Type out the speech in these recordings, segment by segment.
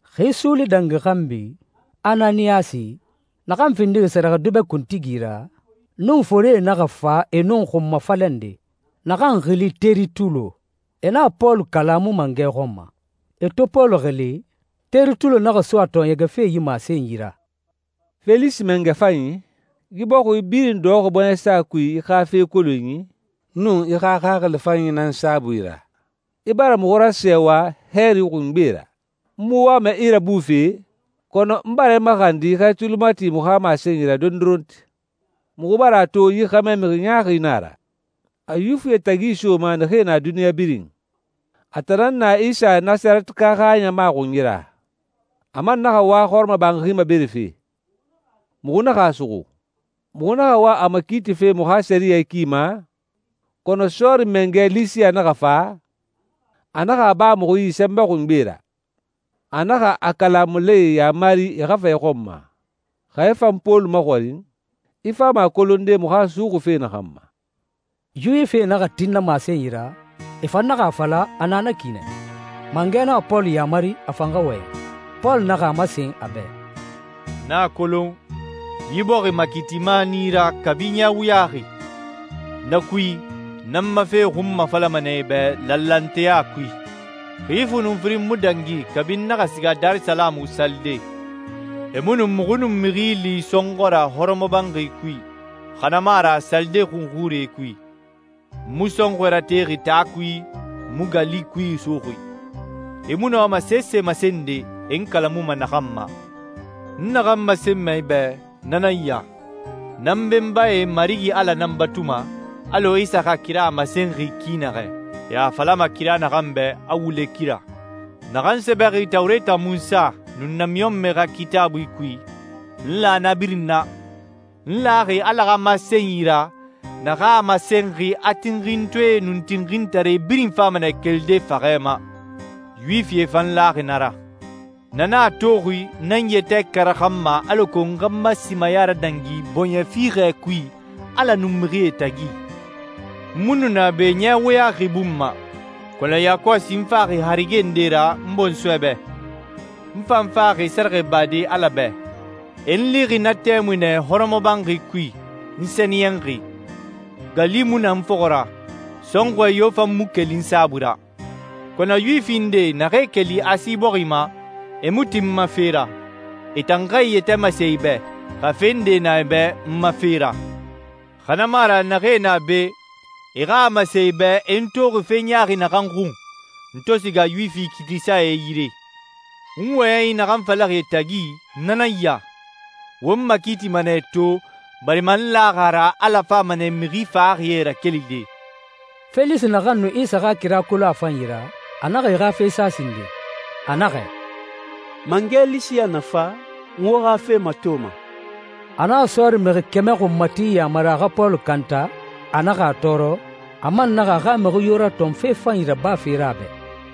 Xi suuli dangi xanbi, Ananiyasi, naxan findixi sɛrɛxɛdubɛ kuntigi ra, nun forie naxa fa e nun xunmafalɛ nde, naxan xili Teritulo. E naxa Pɔlu kalamu mangɛ xɔn ma. E to Pɔlu xili, Teritulo naxa so a tɔɔɲɛgɛfe yi masenyi ra. «Felisi mangɛ fanyi, yi bɔxi birin dɔxɔxi bɔɲɛsa kui i xa fe kolonyi nun i xa xaxili fanyi nan saabui ra. I bara muxu rasɛɛwa hɛɛri xungbe ra. N mu wama i rabufe, kɔnɔ n bara i maxandi i xa i tuli mati muxu xa masenyi ra dondoronti. Muxu bara a to yi xɛmɛ mixi ɲaaxi na a ra. A Yuwifie tagi isoma naxee na duniɲa birin. A tan nan na Isa Nasarɛtika xa ɲama xunyi ra. A man naxa wa hɔrɔmɔbanxi maberefe. Muxu naxa a suxu. Muxu naxa wa a makiitife muxu xa sɛriyɛ ki ma, kɔnɔ sɔɔri mangɛ Lisiya naxa fa, a naxa a ba muxu yi sɛnbɛ xungbe ra. A naxa a kalamulae yaamari e xa fa i xɔn ma. Xa i fan Pɔlu maxɔrin, i fama a kolonde muxu a suxuxi fe naxan ma.» Yuwifie naxa tin na masenyi ra, e fan naxa a fala a na na ki nɛ. Mangɛ naxa Pɔlu yaamari a fan xa wɔyɛn. Pɔlu naxa a masen a bɛ, «N a kolon, yi bɔxi makiitima nan i ra kabi ɲɛ wuyaxi. Na kui, n nan ma fe xunmafalama nɛ i bɛ lanlanteya kui. Xi fu nun firin mu dangi kabi n naxa siga Darisalamu salide. E mu nu muxu nun mixi li sɔnxɔ ra hɔrɔmɔbanxi kui, xa na mu a ra salide xunxurie kui. N mu sɔnxɔɛ ratexi taa kui, n mu gali kui isoxi. E mu nɔma sese masende, e n kalamuma naxan ma. N naxan masenma i bɛ na nan ya. N nan n benbae Marigi Ala nan batuma alɔ Isa xa kira a masenxi ki naxɛ, e a falama kira naxan bɛ a wule kira. Naxan sɛbɛxi Tawureta Munsa nun namiɲɔnmɛe xa Kitaabui kui, n la na birin na. N laxi Ala xa masenyi ra naxan masenxi a tinxintɔɛe nun tinxintare birin fama nɛ kelide faxɛ ma. Yuwifie fan laxi na ra. Na nan a toxi n nan n yɛtɛ karaxanma alako n xa n ma simaya radangi bɔɲɛ fiixɛ kui Ala nun mixie tagi. N mu nu na be ɲɛ wuyaxi bun ma, kɔnɔ yakɔsi n faxi harige nde ra n bɔnsɔɛ bɛ. N fan faxi sɛrɛxɛ bade Ala bɛ. E n lixi na tɛmui nɛ hɔrɔmɔbanxi kui, n sɛniyɛnxi, gali mu na n fɔxɔ ra, sɔnxɔɛ yo fan mu keli n saabui ra. Kɔnɔ Yuwifi nde naxee keli Asi bɔxi ma, e mu tin n ma fe ra. E tan xa e yɛtɛ masen i bɛ, xa fe nde na e bɛ n ma fe ra. Xa na mu a ra naxee na be, e xa a masen i bɛ e n toxi fe ɲaaxi naxan xun, n to siga Yuwifi kiitisae yire. N wɔyɛnyi naxan falaxi e tagi na nan ya: ‹Wo n makiitima nɛ to barima n laxi a ra Ala fama nɛ mixi faxaxie rakelide.›» Felisi naxan nu Isa xa kira kolon a fanyi ra, a naxa e xa fe sa sinden. A naxɛ, «Mangɛ Lisiya na fa, n wo xa fe matoma.» A naxa sɔɔri mixi kɛmɛ xunmati yamari a xa Pɔlu kanta, a naxa a tɔɔrɔ, a man naxa a xa mixi yo ratɔn fe fanyi rabafe ra a bɛ.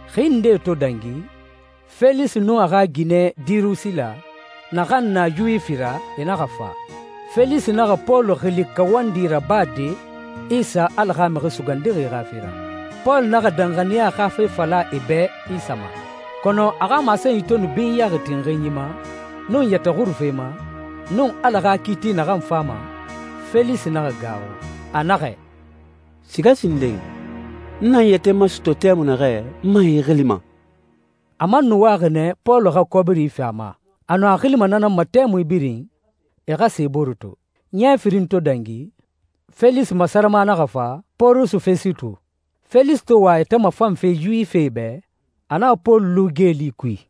Xi ndee to dangi, Felisi nun a xa ginɛ Dirusila, naxan na Yuwifi ra, e naxa fa. Felisi naxa Pɔlu xili kawandi rabade Isa Ala xa Mixi Sugandixi xa fe ra. Pɔlu naxa danxaniya xa fe fala e bɛ Isa ma, kɔnɔ a xa masenyi to nu binyaxi tinxinyi ma, nun yɛtɛ xurufe ma, nun Ala xa kiiti naxan fama, Felisi naxa gaaxu. A naxɛ, «Siga sinden. N na n yɛtɛ masɔtɔ tɛmui naxɛ, n man i xilima.» A man nu waxi nɛ Pɔlu xa kɔbiri fi a ma. A nu a xilima na nan ma tɛmui birin, e xa sa e bore to. Ɲɛ firin to dangi, Felisi masarama naxa fa, Pɔrusu Fɛsitu. Felisi to wa a yɛtɛ mafanfe Yuwifie bɛ, a naxa Pɔlu lu geeli kui.